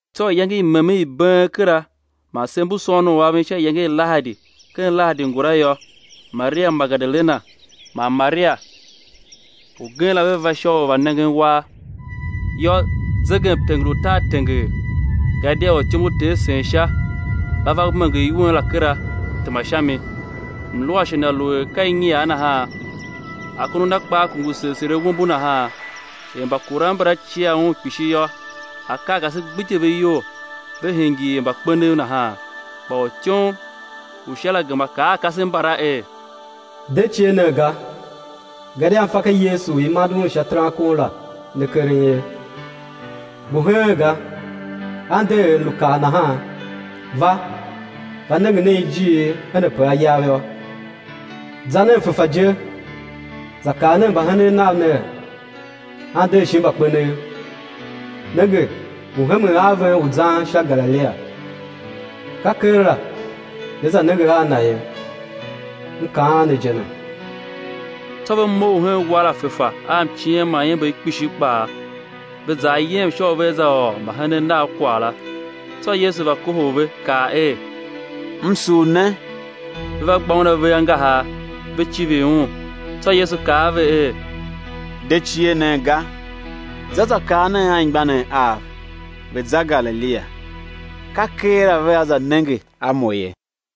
Tsô iyange i memen i been kera man sev mbu sôôn u aven sha iyange i Lahadi ken lahadi ngula yô, Maria Magedalena man Maria ugen la ve va sha u va nengen uwar. Yô, zegemtenger u tar tenger; gadia ortyom u Ter sen Sha, va va menger iwen la kera, tema sha mi. Mluashe na lu er ka inyiar nahan, akondo a na kpaa kungu segh segh er awombo nahan. Er mbakuran mbala cia un kpishi yô, akarkase gbidye ve iyol, ve hingir er mbakpenev nahan. Kpa ortyom u Sha la gema kaa a kasev mbala er: De cie nen ga, gadia m fa ka Yesu u i mande Un sha terankon la ne keren ye. Ngu heen ga, A nder er lu kaa nahan; va, va nenge nen ijiir her ape A yav yô. Za nen fefa je, za kaa nen mbahenen Nav ner, A nder shin mbakpenev, nenge ngu hemen a ven u zan sha Galilia; ka keela né za nenge a Na ye. M kaan ne je ne. Tsô ve mough hen uwar la fefa a mciem man iember kpishi kpaa, ve za ayem sha u vea za ôr mbahenen Nav kwagh la. Tsô Yesu va kohol ve, kaa er: M sugh ne! Ve va gba Un ave angahar, ve civir Un. Tsô Yesu kaa a ve er: De cie nen ga, za za kaa nen anmgbianev Av, ve̱ za Galilia, ka keela ve a za nenge a Mo ye.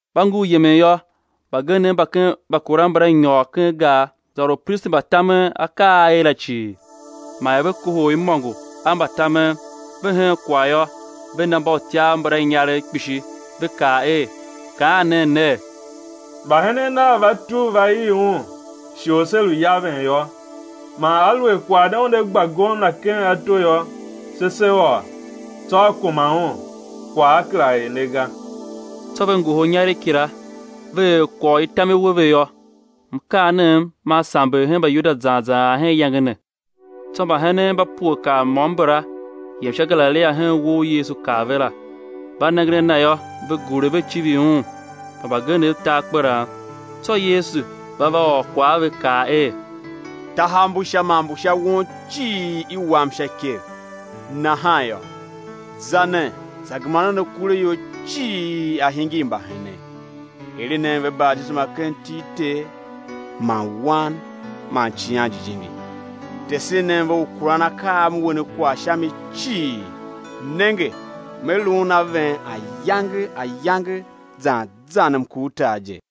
Mba ngur yemen yô, mbagenev mba ken mbakuran mbala nyôr ken gar, za ôr upristi mba tamen akaa a a er la cii. Man er ve kohol imôngo a mbatamen, ve hen kwagh yô, ve na mbautyav mbala inyaregh kpishi, ve kaa er: Kaan nen ner: Mbahenen Nav va tugh va ii Un shighe u se lu yaven yô. Man aluer kwagh ne una gba gomna ken ato yô, se se ôr, tsô á kuma un, kwagh á kera er ne ga. Tsô ve ngohol inyaregh kila, ve er kwagh u i tam i we ve yô. Mkaanem man samber hen Mbayuda zan zan ar hen iyange ne. Tsô mbahenen mba pue kar môm mbala yem sha Galilia hen uwo u Yesu kaa ve la. Mba nengen a Na yô, ve gure ve civir Un, kpa mbagenev ta akperan. Tsô Yesu va va ôr kwagh a ve, kaa er: Tahav mbu Sha man mbu sha won cii i wam sha ikev. Nahan yô, za nen, za gema nen akuraior cii a̱ hingir mbahenen, eren nen ve batisema ken iti i Ter man Wan man Icighan Jijingi. Tesen nen ve u kuran akaa a M we ne kwagh sha mi cii; nenge, Me luun a ven ayange ayange zan zan mkurtar je.